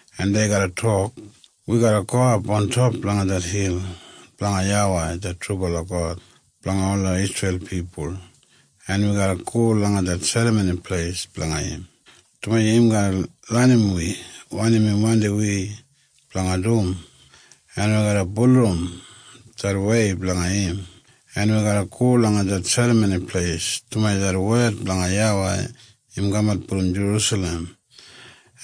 en dei garra tok, ‘Wi garra gowap ontop langa det hil blanga YAWEI det trubala God blanga ola Isreil pipul, en wi garra go langa det Serramoni Pleis blanga im, dumaji im garra lenim wi wanim im wandim wi blanga dum, en wi garra bulurrum det wei blanga im. En wi garra go langa det Serramoni Pleis dumaji det wed blanga YAWEI im kamat brom Jerusalem,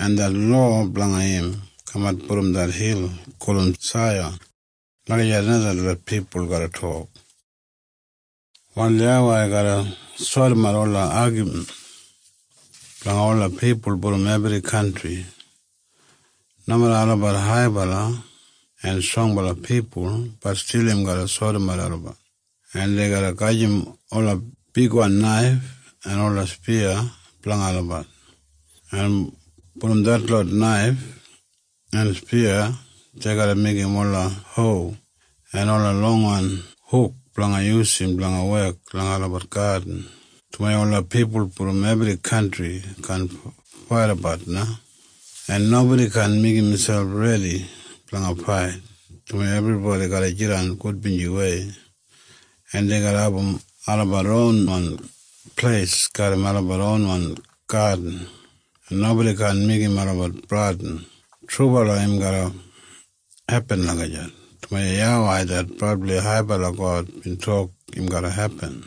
en det lowa blanga im kamat brom det hil gulum Saiyan.’ Lagijat na detlot pipul garra tok. “Wal YAWEI garra sodimat ola agamin blanga ola pipul brom ebri kantri. Nomeda olabat haibala en strongbala pipul, bat stil im garra sodimat olabat. En dei garra gajim ola bigwan naif en ola spiya blanga olabat, en brom detlot naif en spiya dei garra meigim ola ho en ola longwan huk blanga yusum blanga wek langa olabat gadin, dumaji ola pipul brom ebri kantri kaan faidabat na, en nobodi kaan meigim miselp redi blanga fait, dumaji ebribodi garra jidan gudbinjiwei, en dei garra abum olabat ronwan pleis garram olabat ronwan gadin, en nobodi kaan meigim olabat bradin. Trubala im garra hepin lagijat, dumaji YAWEI det brabli haibala God bin tok im garra hepin.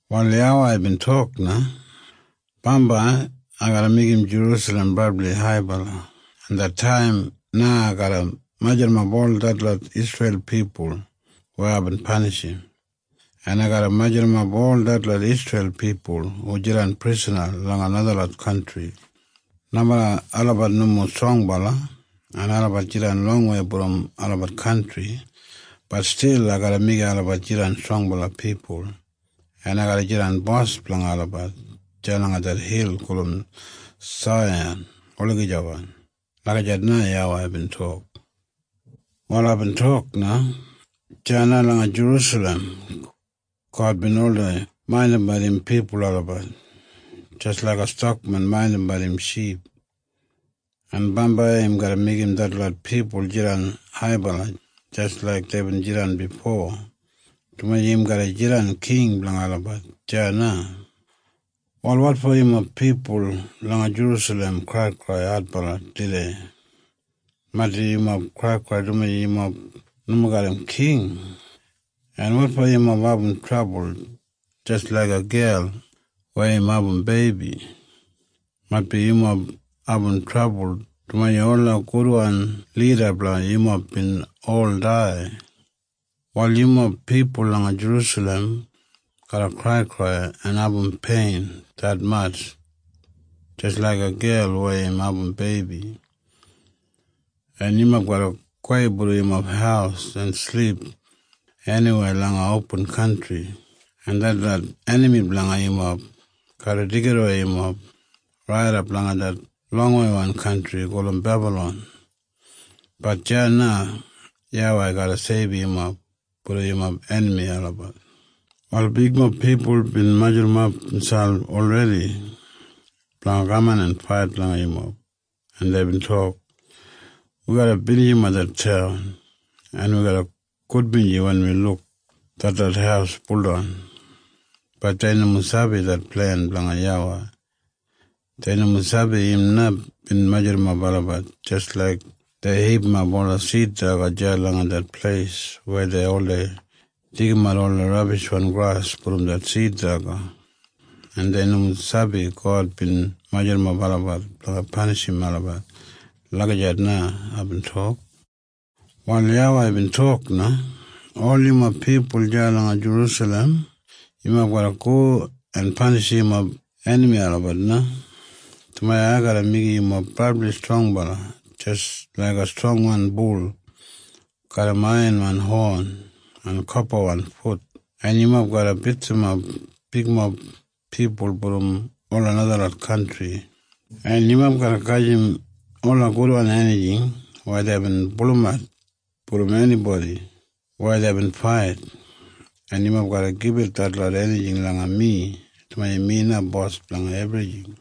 Wal YAWEI bin tok na, “Bambai ai garra meigim Jerusalem brabli haibala, en det taim na ai garra majurrumap ol detlot Isreil pipul weya aibin panishim, en ai garra majurrumap ol detlot Isreil pipul hu jidan prisana langa najalot kantri. Nomeda olabat nomo strongbala en olabat jidan longwei brom olabat kantri, bat stil ai garra meigim olabat jidan strongbala pipul, en ai garra jidan bos blanga olabat deya langa det hil gulum Saiyan olagijawan.” Lagijat na YAWEI bin tok. Wal aibin tok na, “Deya na langa Jerusalem God bin oldei maindimbat im pipul olabat jis laiga stakmen maindimbat im ship, en bambai im garra meigim detlot pipul jidan haibala jis laik deibin jidan bifo, dumaji im garra jidan king blanga olabat deya na. “Wal wotfo yumob pipul langa Jerusalem kraikrai adbala tudei? Maitbi yumob kraikrai dumaji yumob nomo garram king. En wotfo yumob abum trabul jis laiga gel weya im abum beibi? Maitbi yumob abum trabul dumaji ola gudwan lida blanga yumob bin ol dai. “Wal yumob pipul langa Jerusalem garra kraikrai en abum pein detmatj jis laiga gel weya im abum beibi. En yumob garra gowei brom yumob haus en silip eniwei langa opin kantri, en detlot enami blanga yumob garra deigidawei yumob raidap langa det longweiwan kantri gulum Bebalon. Bat deya na YAWEI garra seibum yumob brom yumob enami olabat. “Wal bigmob pipul bin majurrumap miselp olredi blanga kaman en fait langa yumob, en deibin tok, ‘Wi garra binijimap det taun, en wi garra gudbinji wen wi luk detlot haus buldan.’ Bat dei nomo sabi det plen blanga YAWEI. Dei nomo sabi im na bin majurrumap olabat jis laik dei hipimap ola sid daga deya langa det pleis weya dei oldei deigimat ola rabishwan gras brom det sid daga. En dei nomo sabi God bin majurrumap olabat blanga panishim olabat.” Lagijat na aibin tok. Wal YAWEI bin tok na, “Ol yumob pipul deya langa Jerusalem, yumob garra go en panishim yumob enami olabat na, dumaji ai garra meigim yumob brabli strongbala jis laiga strongwan bul garram aiyanwan hon en kopawan fut, en yumob garra bitsimap bigmob pipul brom ola najalot kantri, en yumob garra gajim ola gudwan enijing weya deibin pulumat brom enibodi weya deibin fait, en yumob garra gibit detlot enijing langa mi, dumaji mi na bos blanga ebrijing.”